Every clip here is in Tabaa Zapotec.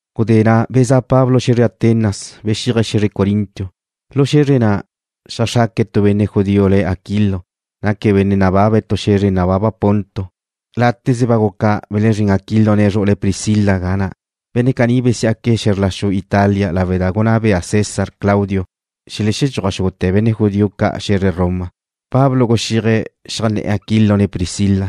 Gudé na' bezá' Pablo xe̱zre Atenas, bexíaje̱' xe̱zre Corinto. Lu xe̱zre na' xeajxraque̱' tu benne' judío le̱' Aquilo, naque̱' benne' nababe̱' tu xe̱zre nababa Ponto. Láteze ba guca belexezrín Aquilo, ne zru'ule̱' Priscila ga na'. Benne' caní besiá'que̱' xe̱zr la xu Italia lawe' da gunná bea César Claudio xelexedxúaj xúgute̱ benne' judío ca' xe̱zre Roma. Pablo guxíaje̱' xeajnné̱'e̱ Aquilo ne Priscila,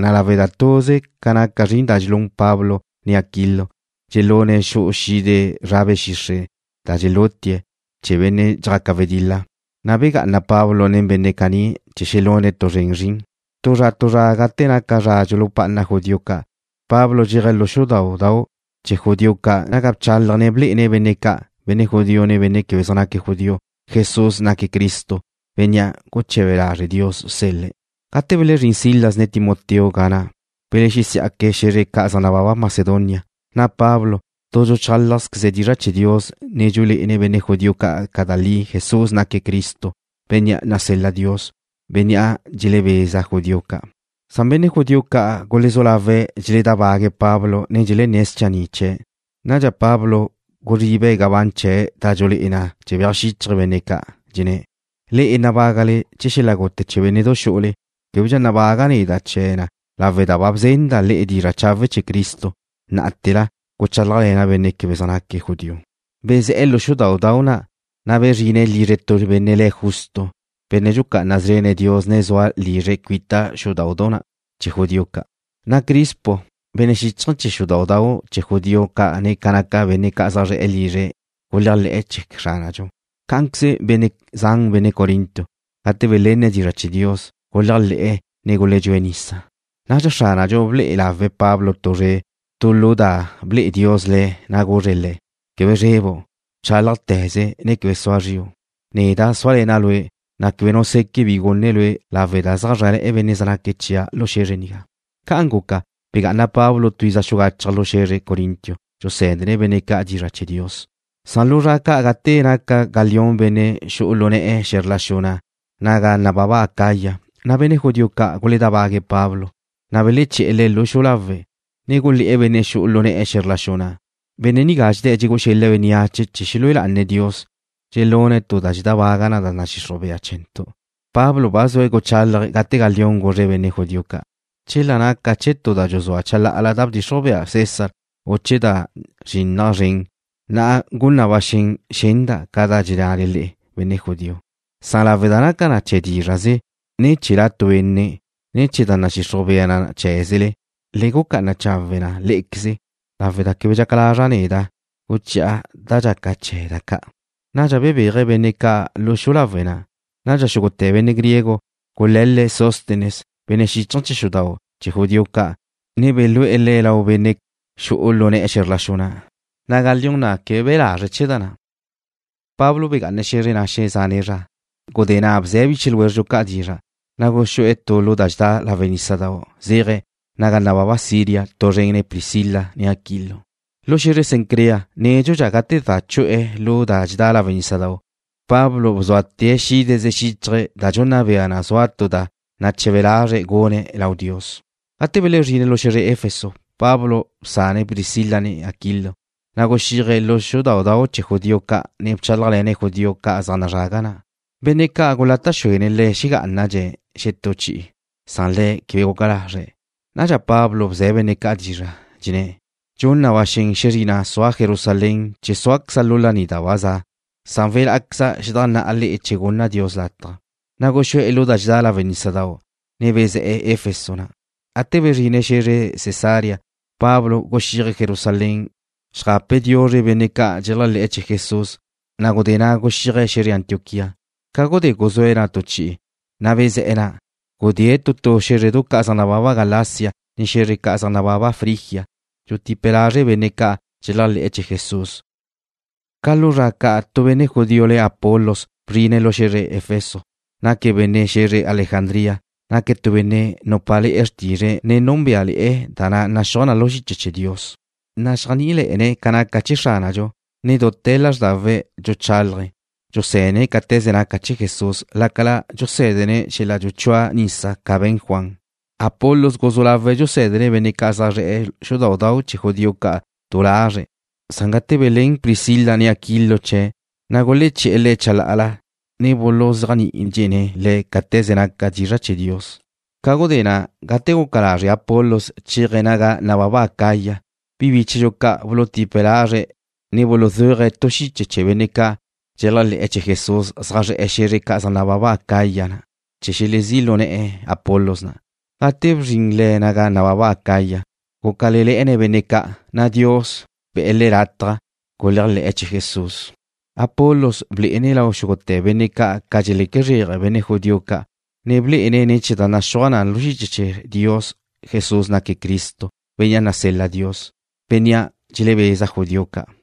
na' lawe' da tuze ca naca zrin da dxelún Pablo ne Aquilo, dxelune̱' xu'u xide zra be̱ xixre' da dxelútie̱' chee̱ benne' dxjaca wedil-la, na' begá'ana Pablo nen benne' caní chee̱ xelune̱' tu zren zrin. Tu zra tu zra gate naca zra dxulupá'ana judío ca', Pablo zéaje̱' lu xudáudau' chee̱ judío ca' naga bchálaje̱', ne blé'ene̱' benne' ca', benne' judío, ne benne' quebe zaj naque̱' judío, Jesús naque̱' Cristo, Bénnea' guche̱be lazre' Dios sel-le̱'. Gate belezrín Silas, ne Timoteo ga na', gudé belexesí'aque̱' xe̱zre ca' zaj nababa Macedonia, na' Pablo tu dxuchálajzqueze̱' dizra' chee̱ Dios, ne dxulé'ene̱' benne' judío ca' da li Jesús naque̱' Cristo, bénnea' nasel-la Dios, bénnea' dxelebeza judío ca'. Benne' judío ca' gulezú lawe̱' dxeledábague̱' Pablo, ne dxelenné̱' schanni' chee̱'. Nadxa Pablo guzribe̱' gabán chee̱' da dxulé'e na dxebéaj xíchaje̱' benne' ca', dxenné̱': ―Le'e nabágale chee̱ xel-la' gute chee̱ bénne'du xu'ule. Québedxa nabaga' neda' chee̱ na lawe' da ba bzenda' le'e dizra' chawe' chee̱ Cristo. Ná'ate̱la guchálajle̱na' benne' quebe zaj naque̱' judío. Bezé̱'e̱ lu xudáudau' na', na' bezrine̱' lizre tu benne' le̱' Justo, benne' dxucá'ana szrene̱' Dios ne zua lizre̱' cuita xudáudau' chee̱ judío ca'. Na' Crispo, benne' xíchaje̱ chee̱ xudáudau' chee̱ judío ca', ne ca naca benne' zaj zre̱'e̱ lizre̱' guléajle̱'e̱ chee̱ Xránadxu. Cá'anqueze benne' zan benne' Corinto, gate belenne̱' dizra' chee̱ Dios, guléajle̱'e̱ ne guledxúe̱' nisa. Nadxa Xránadxu ble'e lawe̱' Pablo tu zre' tu lu da ble'e Dios le̱', ne guzre̱' le̱': ―Quebe zrebu'. Bchálajte̱ze, ne quebe sua zriu'. Neda' zúale̱na' lue', na' quebe nu seque' bi gune lue' lawe' da zaj zrále̱'e̱ benne' zaj naque̱' chia' lu xe̱zre nigá. Ca'an guca, begá'ana Pablo tu iza xugachaj lu xe̱zre Corinto, dxusé̱dene̱' benne' ca' dizra' chee̱ Dios. Lu zra ca' gate naca Galión benne' xu'u lu ne̱'e̱ xe̱zr la xu na' naga nababa Acaya, waláz chee̱ Roma, na' benne' judío ca' guledábague̱' Pablo. Beleché̱'e̱ le̱' xu'u lawe', ne gulé̱'e̱ benne' xu'u lu ne̱'e̱ xe̱zr la xu na': ―Benne' nigá dxedé̱' dxegú'u xel-le̱' bénneache chee̱ xelúe lá'ane̱' Dios, ne xelune̱' tu da dxedábaga da nadxixruj bea chee̱ntu'. Pablo ba zue̱' guchálaje̱' gate Galión guzre̱' benne' judío ca': ―Chela naca na chee̱ tu da dxuzúa chalá'ala da bdxixruj bea César u chee̱ tu da zrinnaj zren, na' gun na ba xen xenda' ca da dxennale le'e, benne' judío. Lawe' da naca na chee̱ dízra'ze, ne chee̱ la tu benne', ne chee̱ da nadxixruj bea na cheé̱zele, le gucá'ana chawe' na lé'equeze, lawe' da quebe dxaca lazra' neda' guchi'e̱ da dxaca chee̱ da ca'. Nadxa bebéaje̱' benne' ca' lu xu'u lawe' na'. Nadxa xúgute̱ benne' griego gule̱l-le̱' Sóstenes, benne' xíchaje̱ chee̱ xudáudau' chee̱ judío ca', ne belú'e̱ le̱' lau benne' xu'u lu ne̱'e̱ xe̱zr la xu na', le̱' Galión. Galión na' quebe be̱' lazre'e chee̱ da na'. Pablo begá'ane̱' xe̱zre na' xezane' zra. Gudé na' bze̱' biche ljwézredxu ca' dizra', na' guxú'e̱ tu lu da dxedá lawe' nísadau' zéaje̱' naga nababa Siria tu zren nen Priscila ne Aquilo. Lu xe̱zre Cencrea nédxudxa gate za chu'e̱ lu da dxedá lawe' nísadau', Pablo bzuate̱' xídeze xíchaje̱', da dxunna bea na zua tu da nache̱be lazre̱' gune̱' lau Dios. Gate belezrine̱' lu xe̱zre Efeso, Pablo bsane̱' Priscila ne Aquilo, na' guxíaje̱' lu xudáudau' chee̱ judío ca', ne bchálajle̱ne̱' judío ca' zaj nazrague̱' na'. Benne' ca' gulata' xuene̱' le̱' xegá'anadxe̱' xetú chi'i, na' le̱' quebe guca lazre̱'. Nadxa Pablo bze̱' benne' ca' dizra', dxenné̱': ―Dxun na ba xen xezrina' sua' Jerusalén chee̱ súaqueza' lu laní da ba za'. Welá'aqueza' xedajnná'a le'e che gunna Dios lataj. Na' guxú'e̱ lu da dxedá lawe' nísadau', ne bezé̱'e̱ Efeso na'. Gate bezrine̱' xe̱zre Cesarea, Pablo guxíaje̱' Jerusalén xeajape̱' diuzre benne' ca' dxeléajle̱'e̱ chee̱ Jesús, na' gudé na' guxíaje̱' xe̱zre Antioquía. Ca gudé guzúe̱' na' tu chi'i, na' bezé̱'e̱ na', gudée̱' tu tu xé̱zredu ca' zaj nababa Galacia, ne xe̱zre ca' zaj nababa Frigia, dxutipe̱' lazre' benne' ca' dxeléajle̱'e̱ chee̱ Jesús. Ca lu zra ca' tu benne' judío le̱' Apolos bzrine̱' lu xe̱zre Efeso, naque̱' benne' xe̱zre Alejandría, lu xu Egipto. Naque̱' tu benne' nupá'ale̱'e̱ xrtizre̱', ne núnbeale̱'e̱ da naxúaj na lu xiche chee̱ Dios. Naxéajni'ile̱'e̱ne̱' ca naca chee̱ Xránadxu, ne dute̱ lázrdawe̱' dxuchálaje̱', dxusé̱dene̱' cáte̱ze naca chee̱ Jesús, lácala dxusé̱dezene̱' xel-la' dxuchúa nisa ca be̱n Juan. Apolos guzú lawe̱' dxusé̱dene̱' benne' ca' zaj zre̱'e̱ xudáudau' chee̱ judío ca' du lazre̱'. Gate belén Priscila, ne Aquilo chee̱', na' guleché̱'e̱ le̱' chalá'ala, ne buluzéajni'idxene̱' le̱' cáte̱ze naca dizra' chee̱ Dios. Ca gudé na', gate guca lazre' Apolos chéaje̱' naga nababa Acaya, bi bíchedxu ca' bulutipe̱' lazre̱', ne buluzuaje̱' tu xiche chee̱ benne' ca' dxeléajle̱'e̱ chee̱ Jesús zaj zre̱'e̱ xe̱zre ca' zaj nababa Acaya na' chee̱ xelezí' lu ne̱'e̱ Apolos na'. Gate bzrin le̱' naga nababa Acaya, gúcale̱le̱'e̱ne̱' benne' ca', na' Dios be̱'e̱ le̱' lataj guléajle̱'e̱ chee̱ Jesús. Apolos blé'ene̱' lau xúgute̱ benne' ca' ca dxeleque zréaje benne' judío ca', ne blé'ene̱' ne̱ chee̱ da naxúaj na lu xiche chee̱ Dios Jesús naque' Cristo, Bénnea' nasel-la Dios, Bénnea' dxelebeza judío ca'.